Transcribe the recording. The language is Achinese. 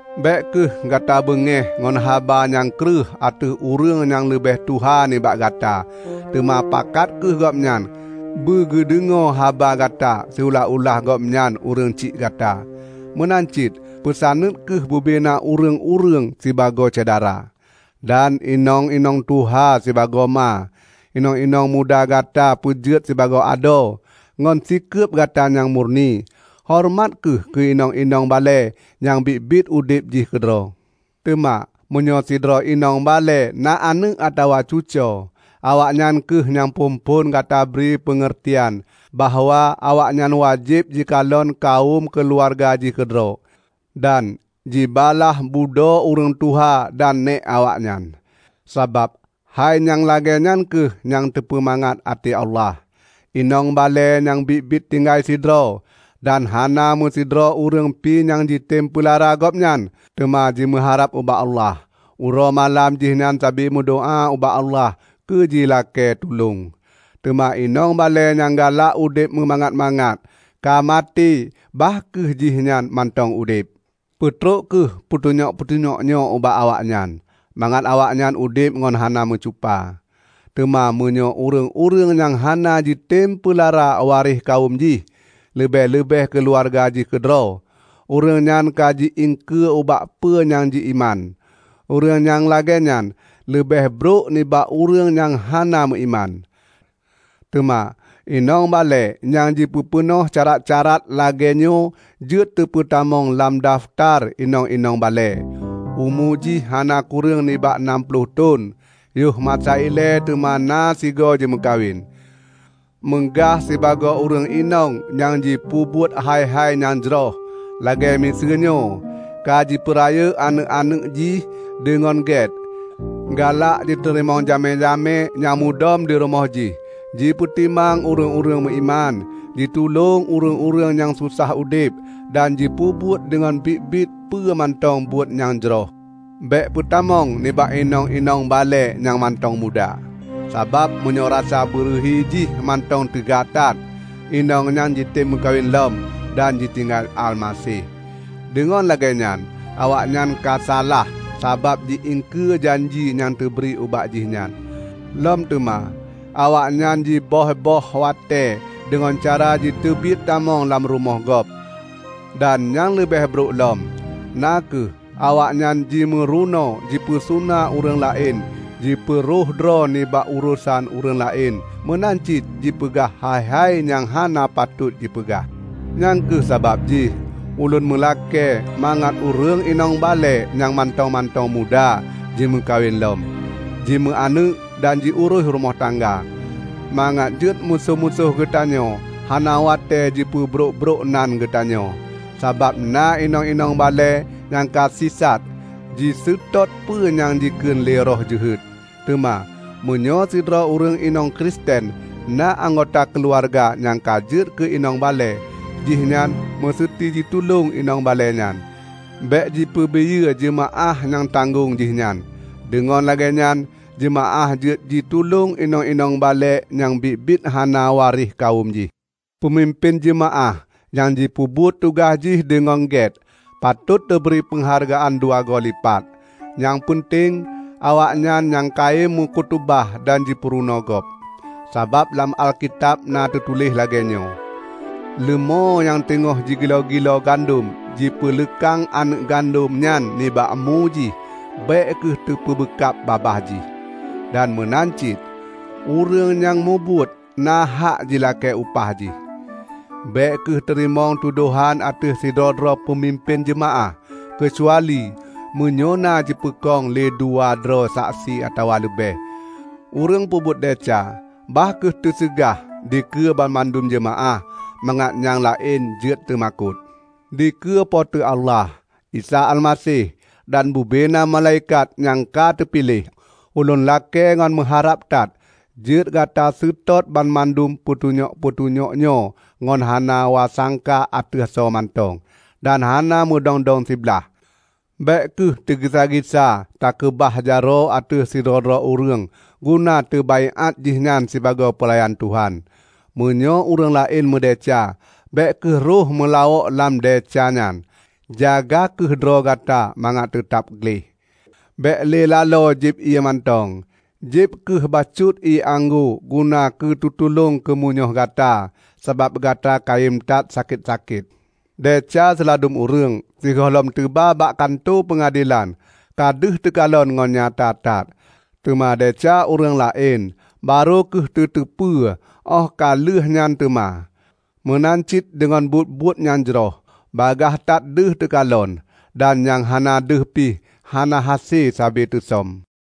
Bék kheueh gata beungéh ngon haba nyang kreueh ateueh ureuëng nyang leubeh tuha nibak gata teuma pakat kheueh gobnyan beugeudeungoe haba gata siulah-ulah gobnyan ureuëng syiek gata. Meunan cit peusaneut kheueh bubena ureuëng-ureuëng sibagoe syedara, dan inong-inong tuha sibagoe ma. Inong-inong muda gata peujeuet sibagoe adoe, ngon sikeueb gata nyang murni. Horeumat kheueh keu inong-inong balée nyang biet-biet udeb jih keudroe. Teuma meunyoe sidroe inong balée na aneuëk atawa cucoe, awaknyan kheueh nyang phon-phon gata bri peungeurtian bahwa awaknyan wajéb jikalon kawöm keuluwarga jih keudroe, dan jibalaih budoe ureuëng tuha dan nék awaknyan. Sabab hai nyang lagée nyan kheueh nyang teupeumangat até Allah. Inong balée nyang biet-biet tinggai sidroe, dan hana meusidroe ureuëng pi nyang jitem peulara gobnyan, teuma jimeuharab ubak Allah. Uroe malam jihnyan sabe meudoá ubak Allah keu jilakée tulông. Teuma inong balée nyang galak udeb meumangat-mangat, ka maté bah kheueh jihnyan mantong udeb. Peutrok kheueh peutunyok-peutunyok nyoe ubak awaknyan, mangat awaknyan udeb ngon hana meucupa. Teuma meunyoe ureuëng-ureuëng nyang hana jitem peulara waréh kawöm jih, leubeh-leubeh keuluwarga jih keudroe, ureuëng nyan ka ji iengkeue ubak peue nyang ji-iman; ureuëng nyang lagée nyan leubeh brok nibak ureuëng nyang hana meuiman. Teuma inong balée nyang jipeupeunoh syarat-syarat lagée nyoe jeuet teupeutamong lam dafeutar inong-inong balée; umu jih hana kureueng nibak nam ploh thon, yoh masa ilée teuma na sigoe jimeukawen, meugah sibagoe ureuëng inong nyang jipeubuet hai-hai nyang jroh, lagée miseue nyoe: ka jipeurayeuk aneuëk-aneuëk jih deungon gét, galak jiteurimong jamé-jamé nyang mudom dirumoh jih, jipeutimang ureuëng-ureuëng meuiman, jitulông ureuëng-ureuëng nyang susah udeb, dan jipeubuet deungon biet-biet peue mantong buet nyang jroh. Bék peutamong nibak inong-inong balée nyang mantong muda. Sabab meunyoe rasa beureuhi jih mantong teuga that, inong nyan jitem meukawen lom, dan jitinggai Almaseh. Deungon lagée nyan awaknyan kasalah sabab ji-iengkeue janji nyang teubri ubak jihnyan. Lom teuma awaknyan jiböih-böih watée deungon cara jiteubiet tamong lam rumoh gob. Dan nyang leubeh brok lom, na kheueh awaknyan jimeurunoe jipeusuna ureuëng laén jipeurhoh droe nibak urosan ureuëng laén meunan cit jipeugah hai-hai nyang hana patot jipeugah. Nyang kheueh sabab jih ulôn meulakée mangat ureuëng inong balée nyang mantong-mantong muda jimeukawen lom, jimeu aneuëk dan jiurôih rumoh tangga, mangat jeuet musoh-musoh geutanyoe hana watée jipeubrok-brok nan geutanyoe. Sabab na inong-inong balée nyang ka sisat jiseutôt peue nyang jikheun lé roh jeuhet. Teuma, meunyoe sidroe ureuëng inong Kristen na anggota keuluwarga nyang ka jeuet keu inong balée, jihnyan meuseuti jitulông inong balée nyan; bék jipeubiyeu jeumaáh nyang tanggong jih nyan. Deungon lagée nyan jeumaáh jeuet jitulông inong-inong balée nyang biet-biet hana waréh kawöm jih. Peumimpén jeumaáh nyang jipeubuet tugaih jih deungon gét, patot teubri peunghargaan dua goe lipat, nyang peunteng awaknyan nyang kayém meukutubah dan jipeurunoe gob. Sabab lam Alkitab na teutuléh lagée nyoe, "Leumô nyang teungoh jigiloe-giloe gandom jipeuleukang aneuëk gandom nyan nibak mu jih, bék kheueh teubeukab babah jih", dan meunan cit, "Ureuëng nyang mubuet, na hak jilakée upah jih". Bék kheueh teurimong tudohan ateueh sidroe-droe peumimpén jeumaáh, keucuali meunyoe na jipeukong lé dua droe saksi atawa leubeh. Ureuëng peubuet desya, bah kheueh teuseugah dikeue banmandum jeumaáh, mangat nyang laén jeuet teumakot. Dikeue Po teu Allah, Isa Almaseh, dan bubena malaikat nyang ka teupiléh, ulôn lakée ngon meuharab that jeuet gata seutôt banmandum peutunyok-peutunyok nyoe ngon hana wasangka ateueh soe mantong, dan hana meudong-dong siblaih. Bék kheueh teugisa-gisa takeubah jaroe ateueh sidroe-droe ureuëng guna teubaiát jihnyan sibagoe peulayan Tuhan. Meunyoe ureuëng laén meudesya, bék kheueh rhoh meulawok lam desya nyan. Jaga kheueh droe gata mangat teutab gleh. Bék lé laloe jieb ié mantong; jieb kheueh bacut ié anggô guna keutulông keumunyoh gata, sabab gata kayém that sakét-sakét. Desya siladum ureuëng, sigohlom teuba bak kantô peungadelan, ka deuh teukalon ngon nyata that. Teuma desya ureuëng laén barô kheueh teu teupeue óh ka lheueh nyan teuma. Meunan cit deungon buet-buet nyang jroh bagaih that deuh teukalon. Dan nyang hana deuh pih, hana hase sabe teusöm.